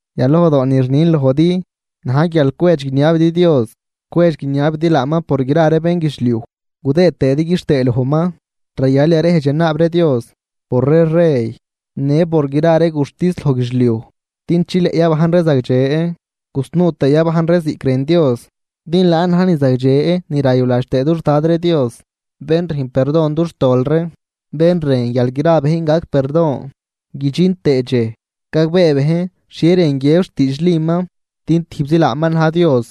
Yalojdoo ni rnin lojdi na̱j guial cwedx guiniabidi Dios, cwedx guiniabidi laaman por gra ree bénguidxliuj, gudëëd tëëdi quixtëë lojman. Rayal yarejdx yanaab ree Dios por ree rey në por gra ree guxtis loj guidxliuj din chileꞌ yabajn ree zagdxe gusnuu tëe yabajn ree ziꞌc rën Dios. Din laan na̱j ni zagdxe ni rayuladx tëë dux Dad ree Dios, bén rüjn perdon dux tol ree, bén rën guial gra bejn gac perdon guidxin tëë dxej gagbee bejn xhie rën guiëb xtiidxliman. Din tijbzi laaman na̱j Dios,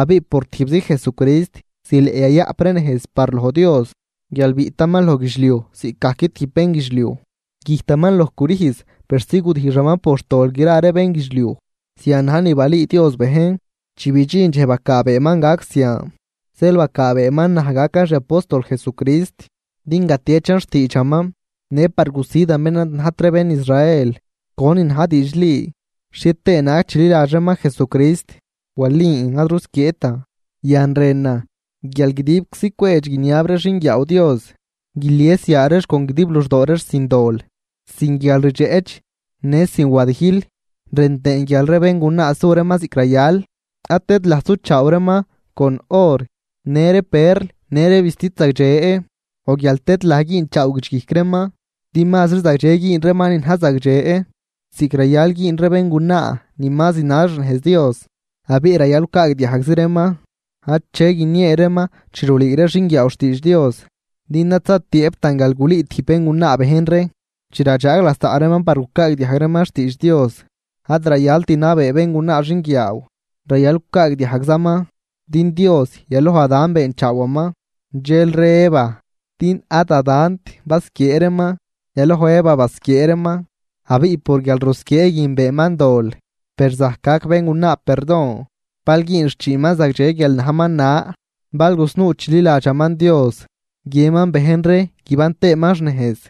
abiꞌ por tijbzi Jesucrist zileꞌ yayaꞌp ree nejz par loj Dios guial biꞌtaman loj guidxliuj ziꞌcgajc tijb bénguidxliuj. Güjtaman loj crüjz persi gudijxaman por xtol gra ree bénguidxliuj, zian naj ni balüü Dios bejn chi bidxin dxej bacaabeeman gac zian. Zeel bacaabeeman naj gacan xi apóstol Jesucrist din gatiechan xtiidxaman, në par gusidan bén ad najt ree bén Israel conin na̱j diidxli, xhie tëë naag chililadx reeman Jesucrist, walin ad rusquieetan. Yan rënan guial guidibczi cwedx guiniab ree xinguiaaw Dios, guilies yaa reex con guidib luxdoo reex sin dol, sin guialrdxeꞌch në sin wadijl. Rën tëën guial ree béngunaa su reeman ziꞌc rayal, ad tëdlaj suchaaw reeman con or, në ree perl në ree vistid zagdxe o guial tëdlaj güünchaaw guidxguijc reeman. Din mazri zagdxe güün reeman ni na̱j zagdxe, ziꞌc rayal güün ree béngunaa ni ma zinal xnejz Dios. Abiꞌ rayal gucaagdiajgzi reeman ache guiniee reeman chi rulüü ree xinguiaaw xtiidx Dios. Din ad zatiëëbtan guial gulüü tijb béngunaa bejn ree chi radxaag lasaꞌ reeman par gucaagdiajg reeman xtiidx Dios, ad rayalt nabee béngunaa xinguiaaw, rayal gucaagdiajgzaman. Din Dios, yaloj Adán beenchaawaman, dxelri Eva. Din ad Adánt basquiee reeman, yaloj Eva basquiee reeman, abiꞌ por guialrusquiee guin beenman dol. Per zajc gac béngunaa perdon, bal güün xchiinman zagdxe guial najman na, bal gusnuu chililadxaman Dios, guiënman bejn ree guiban tëëman xnejz.